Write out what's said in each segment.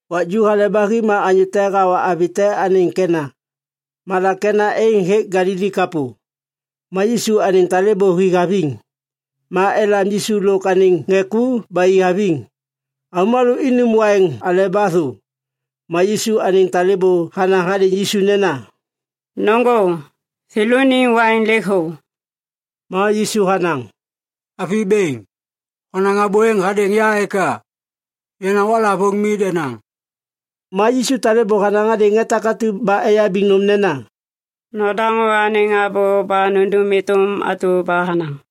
Wak ju hale ba hi ma anyô te hawa avi te anêŋ Kena. Malak Kena êŋ hêk Galili kapô. Ma Yisu anêŋ talêbô hi haviŋ. Ma elam Yisu lôk anêŋ ŋê ku ba i haviŋ. Avômalô inum waiŋ aleba thô. Ma Yisu anêŋ talêbô hanaŋ hadêŋ Yisu nena, “Nôŋgô! Thêlôniŋ waiŋ lêk thô.” Ma Yisu hanaŋ, “Avi bêŋ, honaŋ abô êŋ hadêŋ ya eka? Yenaŋ waklavôŋ mi denaŋ.” Ma Yisu talêbô hanaŋ hadêŋ ŋê takatu ba eyabiŋ nôm nena, “Nodaŋô anêŋ abô ba nundum êtôm atu ba hanaŋ.”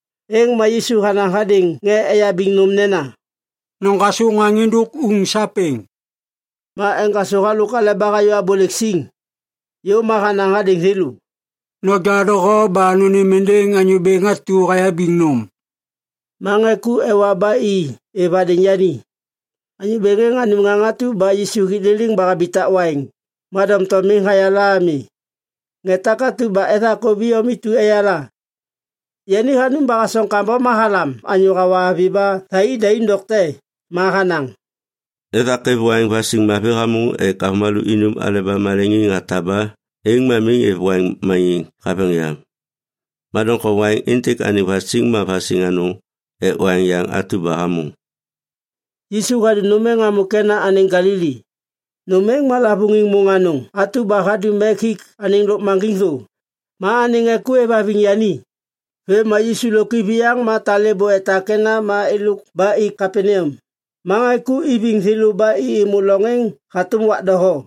Êŋ ma Yisu hanaŋ hadêŋ ŋê eyabiŋ nôm nena, “Noŋgasô ŋaŋ êndôk uŋ sapêŋ.” Ma eŋgasô halôk aleba hayô abôlêk siŋ. Yôv ma hanaŋ hadêŋ thêlô, “Noja doho ba nônêm êndêŋ anyô bêŋ atu hayabiŋ nôm.” Ma ŋê ku ewa ba i êv hadêŋ yani. Anyô bêŋ êŋ hanum ŋaŋ atu ba Yisu hik liliŋ ba habitak waiŋ. Ma doŋtom miŋ hayala ami. Ŋê takatu ba ethakôv iyom intu eyala. Yani hanum ba hasoŋ kambom ma halam anyô hawa avi ba thai i daim dokte ma hanaŋ, “Ethak êv waiŋ vasiŋ mavi hamôŋ ek avômalô inum aleba maleŋiŋ hataba êŋ ma miŋ êv waiŋ maniŋ haveŋ yam. Ma doŋtom waiŋ êntêk anêŋ vasiŋ ma vasiŋ anôŋ ek waiŋ yaŋ atu ba hamôŋ.” Yisu hadum nôm êŋ hamô Kena anêŋ Galili. Nôm êŋ ma lavôŋiŋ môŋ anôŋ atu ba hadum ek hik anêŋ lôkmaŋgiŋ thô. Ma anêŋ ŋê ku êvhaviŋ yani. Vêm ma Yisu lôk iviyaŋ ma talêbô etak Kena ma êlôk ba i Kapaneam. Ma ŋê ku iviŋ thêlô ba i êmô loŋ êŋ hatôm wak doho.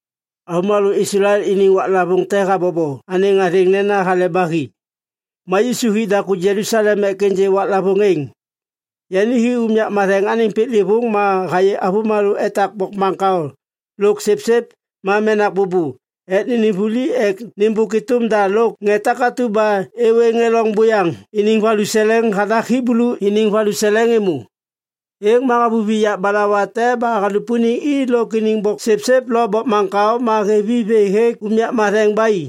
Avômalô Islael iniŋ waklavôŋ te habobo anêŋ athêŋ nena Hale ba Hi. Ma Yisu hi daku Jelusalem ek ênjê waklavôŋ êŋ. Yani hi unyak matheŋ anêŋ piklêvôŋ ma hayê avômalô etak bokmaŋkao lôk sipsip ma menak bôbô ek nênêm vuli ek nêmbôk êtôm da lôk ŋê takatu ba êwê ŋê loŋ buyaŋ iniŋ valuseleŋ hathak Hiblu iniŋ valuseleŋ êmô. Êŋ ma havuvi yak balawa te ba halupuniŋ i lôk iniŋ boksipsip lo bokmaŋkao ma hêv i vê hêk unyak matheŋ ba i.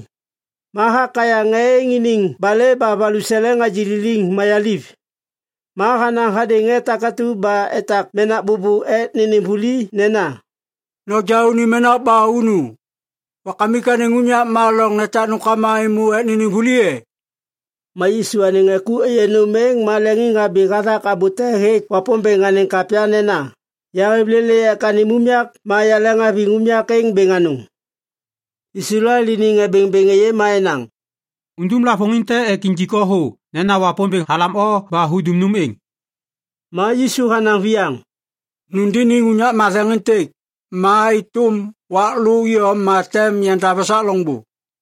Ma hakayaŋ ŋê êŋ iniŋ balê ba valuseleŋ hagililiŋ mayaliv. Ma hanaŋ hadêŋ ŋê takatu ba etak menak bôbô ek nênêm vuli nena, “Noja unim menak ba unu! Wakamik anêŋ unyak ma loŋ netak nômkama êmô ek nênêm vuli e?” Ma Yisu anêŋ ŋê ku êyê nôm êŋ ma leŋiŋhabi hathak abô te hêk Wapômbêŋ anêŋ kapya nena, “Yahêv lêlê ek anêm unyak ma yaleŋhaviŋ unyak êŋ bêŋ anôŋ.” Islael iniŋ ŋê bêŋbêŋ êyê ma enaŋ, “Undum lavôŋiŋ te ek injik o thô nena Wapômbêŋ halam o ba hudum nôm êŋ!” Ma Yisu hanaŋ viyaŋ, “Nundiniŋ unyak matheŋ êntêk, ma êtôm wak lô iyom ma tem yandav esak loŋbô.”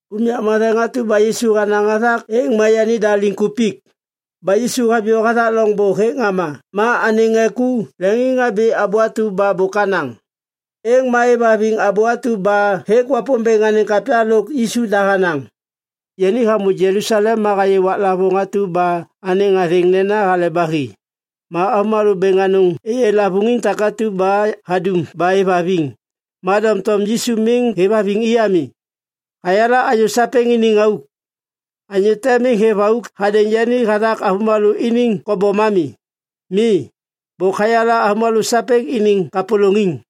Unyak matheŋ atu ba Yisu hanaŋ hathak êŋ ma yanida liŋkupik. Ba Yisu haviyô hathak loŋbô hêk ŋama ma anêŋ ŋê ku leŋiŋhabi abô atu ba bôk hanaŋ. Êŋ ma êvhaviŋ abô atu ba hêk Wapômbêŋ anêŋ kapya lôk Yisu da hanaŋ. Yani hamô Jelusalem ma hayê waklavôŋ atu ba anêŋ athêŋ nena Hale ba Hi. Ma avômalô bêŋ anôŋ êyê lavôŋiŋ takatu ba hadum ba êvhaviŋ. Ma doŋtom Yisu miŋ hêvhaviŋ i ami. Hayala anyô sapêŋ iniŋ auk. Anyô te miŋ hêv auk hadêŋ yani hathak avômalô iniŋ kobom ami. Mi, bôk hayala avômalô sapêŋ iniŋ kapôlôŋiŋ.